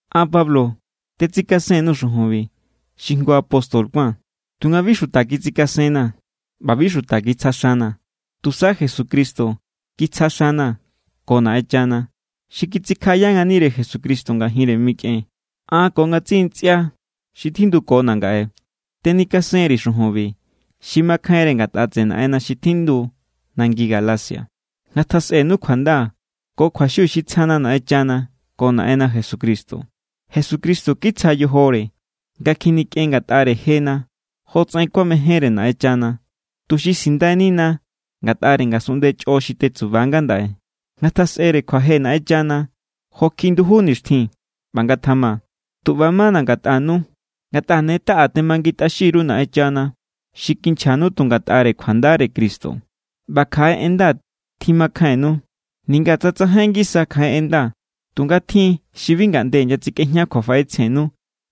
An, Pablo, tetsikasen_nuu̱ xujunbi, xi jngu apóstol kuáa̱n. Tunga bi xuta kitsikasenna̱ ꞌba bi xuta kitsja xana̱. Tusa Jesucristo kitsja xana̱ ko Naꞌenchana, xi kitsikjaꞌaya nganire Jesucristo ngajinre mikꞌen. An ko ngatsiꞌi ntsꞌia xi tjindukona̱ ngaꞌe tenikasen_ri̱ xujunbi xi makjainre ngatꞌa tseꞌe Naꞌenna xi tjindu nangi Galacia. Ngatjasꞌenu kjuanda ko kjuaxiu xi tsjana Naꞌenchana ko Naꞌenna Jesucristo. Jesucristo kitsja yojore nga kjinikꞌen ngatꞌare jena jotsaꞌen kuamejénre Naꞌenchana, tuxi sindainina ngatꞌare ngasunꞌnde chꞌo xi tetsuba ngandaꞌe. ¡Ngatjasꞌere kjuaje Naꞌenchana jo kjiꞌi nduju nixtjin! ꞌBa ngatjama. Tu ꞌba= mana̱ ngatꞌanu. Ngatꞌa ne taꞌa temangintꞌaxin_ru Naꞌenchana xi kinchjanu tu ngatꞌare kjuandare Cristo. ꞌBa kjaꞌe en nda tjimakjainnu, ninga tsa tsajain ngisa kjaꞌe en nda. Tunga tjin= xi bi ngaꞌnde inyatsikꞌejña kjuafaꞌetsjennu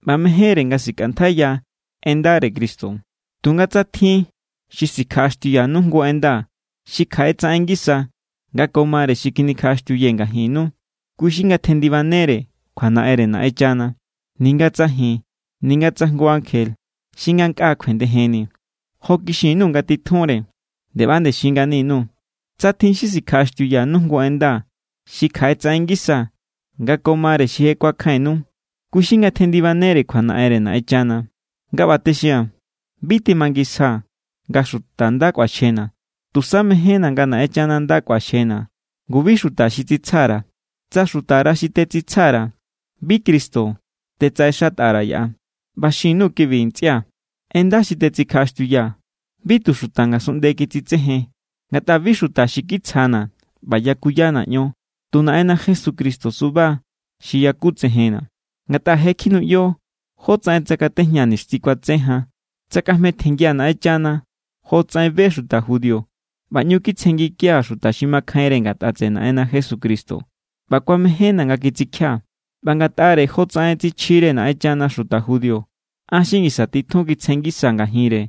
ꞌba mejénre nga sikꞌantjaiya en ndare Cristo. Tunga tsa tjin xi sikjaꞌaxtiuyanu jngu en nda xi kjaꞌetsaꞌen ngisa nga ko mare xi kjinikjaꞌaxtiuyee̱ ngajinnu, kui xi ngatjendibanere kjuanaꞌenre Naꞌenchana, ninga tsa ji̱n ninga tsa jngu ankje xi ngankꞌa kjuendejenni. Jo kixin_nuu̱ nga titjunre, nde ꞌba=nde xin ngani_nuu̱: Tsa tjin xi sikjaꞌaxtiuyanu jngu en nda xi kjaꞌetsaꞌen ngisa nga ko mare xi je kuakjainnu, kui xi ngatjendibanere kjuanaꞌenre Naꞌenchana. Nga ꞌba texia̱n, bi temangisjaa̱ nga xuta nda kꞌuaxjena̱. Tusa mejénna̱ nga Naꞌenchana nda kꞌuaxjena̱. Ngu, bi xuta xi tsitsja_ra̱. Tsa xutara xi tetsitsja_ra̱, bi Cristo tetsaꞌexatꞌa_ra̱ yaꞌa. ꞌBa xin_nuu̱ kibi, ntsꞌia̱. En nda xi tetsikjaꞌaxtiuyaa̱, bi tu xuta ngasunꞌnde kitsitsejen. Ngatꞌa bi xuta xi kitsjana̱ ꞌba yakuyana̱ ion, tu Naꞌenna Jesucristo suba xi yakutsejenna̱. Ngatꞌa je kjinuꞌyo jotsaꞌen tsakatejñaa̱ nixtjin kuatse jan. Tsakꞌajmetjenngia̱ Naꞌenchana jotsaꞌen be xuta judío. ꞌBa ꞌñu kitsjenngikia̱ xuta xi makjainre ngatꞌa tseꞌe Naꞌenna Jesucristo ꞌba kuamejénna̱ nga kitsikjia̱. ꞌBa ngatꞌare jotsaꞌen tsichjire Naꞌenchana xuta judío, an xi ngisa titjun kitsjen ngisaa̱ ngajinre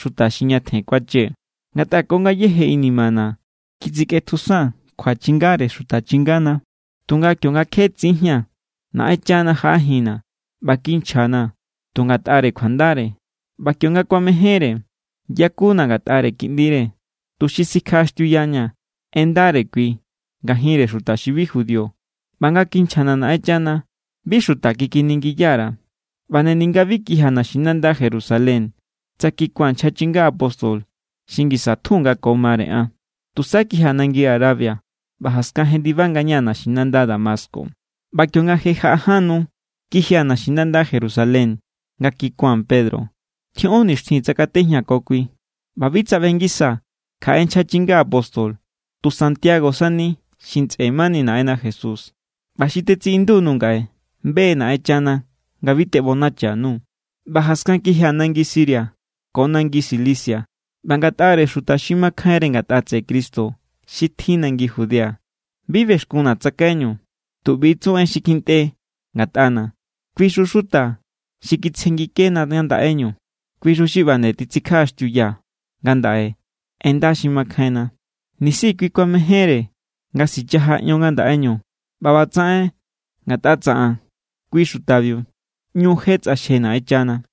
xuta xi ñatjen kuachee̱. Ngatꞌa ko ngayéje inimana̱ kitsikꞌetjusaa̱n kjuachingare xuta chingana̱. Tunga kionga kje tsinjía̱n, Naꞌenchana jaꞌajinna̱ ꞌba kinchjana̱ tu ngatꞌare kjuandare. ꞌBa kionga kuamejénre, yakuna̱ ngatꞌare Kiꞌndire, tuxi sikjaꞌaxtiuyañaa̱ en ndare kui ngajinre xuta xi bi judío. ꞌBa nga kinchjana̱ Naꞌenchana, bi xuta kikiningiya_ra̱, ꞌba nde ninga bi kijia̱ naxinanda Jerusalén tsa kikua̱n nchja chinga apóstol xi ngisa tjun nga ko mare an. Tusa kijia̱ nangi Arabia, ꞌba jaskan jendiba ngañaa̱ naxinanda Damasco. ꞌBa kionga je jaꞌa ján nu, kijia̱ naxinanda Jerusalén nga kikua̱n Pedro. Tjioꞌon nixtjin tsakatejñaa̱ ko kui. ꞌBa bi tsaꞌbe ngisaa̱ kjaꞌe nchja chinga apóstol, tu Santiago sani xi ntsꞌe mani Naꞌenna Jesús. ꞌBa xi tetsiꞌindu_nuu̱ ngaꞌe, be= Naꞌenchana nga bi teꞌbonacha_nuu̱. ꞌBa jaskan kijia̱ nangi Siria ko nangi Cilicia. ꞌBa ngatꞌare xuta xi makjainre ngatꞌa tseꞌe Cristo xi tjin nangi Judea, bi bexkunna̱ tsakaiñu. Tu ꞌbi= tsu en xi kjintꞌe ngatꞌana̱: “Kuixu xuta xi kitsjengikena ngandaꞌeñu, kuixu xi ꞌba nde tsikjaꞌaxtiuya ngandaꞌe en nda xi makjainna, nisi kui kuamejénre nga sichaja ion ngandaꞌeñu.” ꞌBa ꞌbatsaꞌen ngatꞌa tsaꞌan kui xutabiu ꞌñu je tsꞌaxje Naꞌenchana.